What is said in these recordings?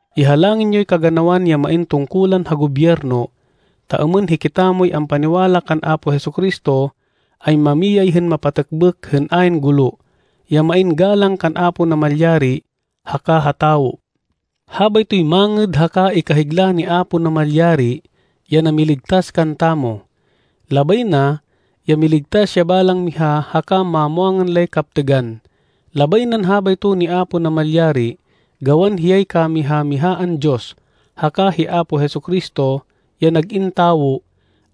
Ihalangin yoy kaganawan ya main tungkulan ha gobyerno, ta êmên hikitamoy ampaniwala kan Apo Jesu-Cristo, ay mamiyay hên mapatêkbêk hên ayn gulo, ya main galang kan Apo Namalyari haka ha tawo. Habaytoy mangêd haka ikahigla ni Apo Namalyari ya namiligtas kantamo. Labay na, ya miligtas ya balang miha haka mamwangan lay kaptêgan. Labay nan habayto ni Apo Namalyari, gawan hiyay kamiha-mihaan Diyos. Haka hi Apo Jesu-Cristo, ya nag-in tawo,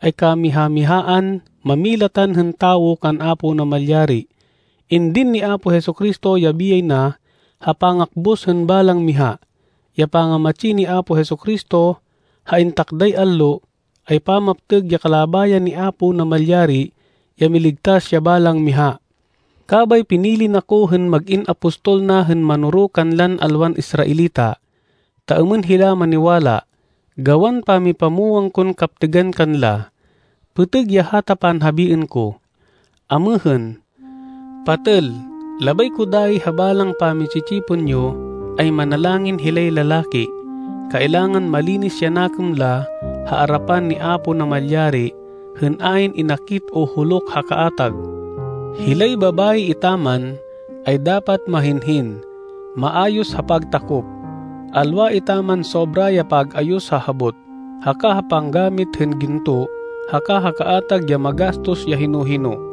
ay kamiha-mihaan mámilatan hên tawo kan Apo Namalyari. Indin ni Apo Jesu-Cristo ya biyay na ha pangakbus hên balang miha. Ya pangamatsi ni Apo Jesu-Cristo ha intakday allo, ay pamaptêg ya kalabayan ni Apo Namalyari, ya miligtas ya balang miha. Kabay pinili na ko hên mag-in apostol na hên manoro kanlan alwan Israelita, ta êmên hila maniwala, gawan pamipamwang kon kaptêgan kanla. Pêtêg ya hata panhabiên ko. Amêhên, patêl, labay ko dayi ha balang pami-tsi-tsipon yo, ay manalangin hilay lalaki. Kailangan malinis ya nakêm la ha arapan ni Apo Namalyari hên ayn inakit o huluk ha kaatag. Hilay babayi etaman, ay dapat mahinhin, maayos ha pagtakop, alwa etaman sobra ya pag-ayos ha habot, haka ha panggamit hên ginto haka ha kaatag ya magastos ya hino-hino.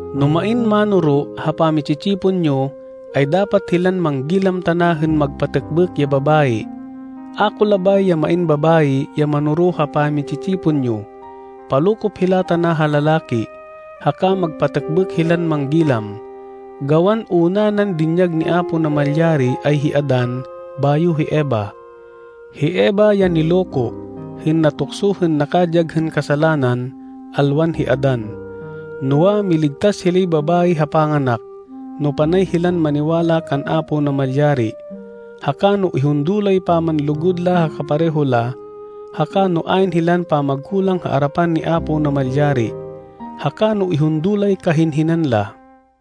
No main mánoro ha pami-tsi-tsipon yo, ay dapat hilan manggilam tana hên magpatêkbêk ya babayi. A ko labay ya main babayi ya manoro ha pami-tsi-tsipon yo. Palokop hila tana ha lalaki, haka magpatêkbêk hilan manggilam. Gawan una nan dinyag ni Apo Namalyari, ay hi Adan bayo hi Eva. Hi Eva ya niloko, hên natukso hên nakadyag hên kasalanan, alwan hi Adan. Noa, miligtas hilay babayi ha panganak, no panay hilan maniwala kan Apo Namalyari, haka no ihundo lay pamanlugud la ha kapareho la, haka no ayn hilan pamagkulang ha arapan ni Apo Namalyari, haka no ihundo lay kahinhinan la.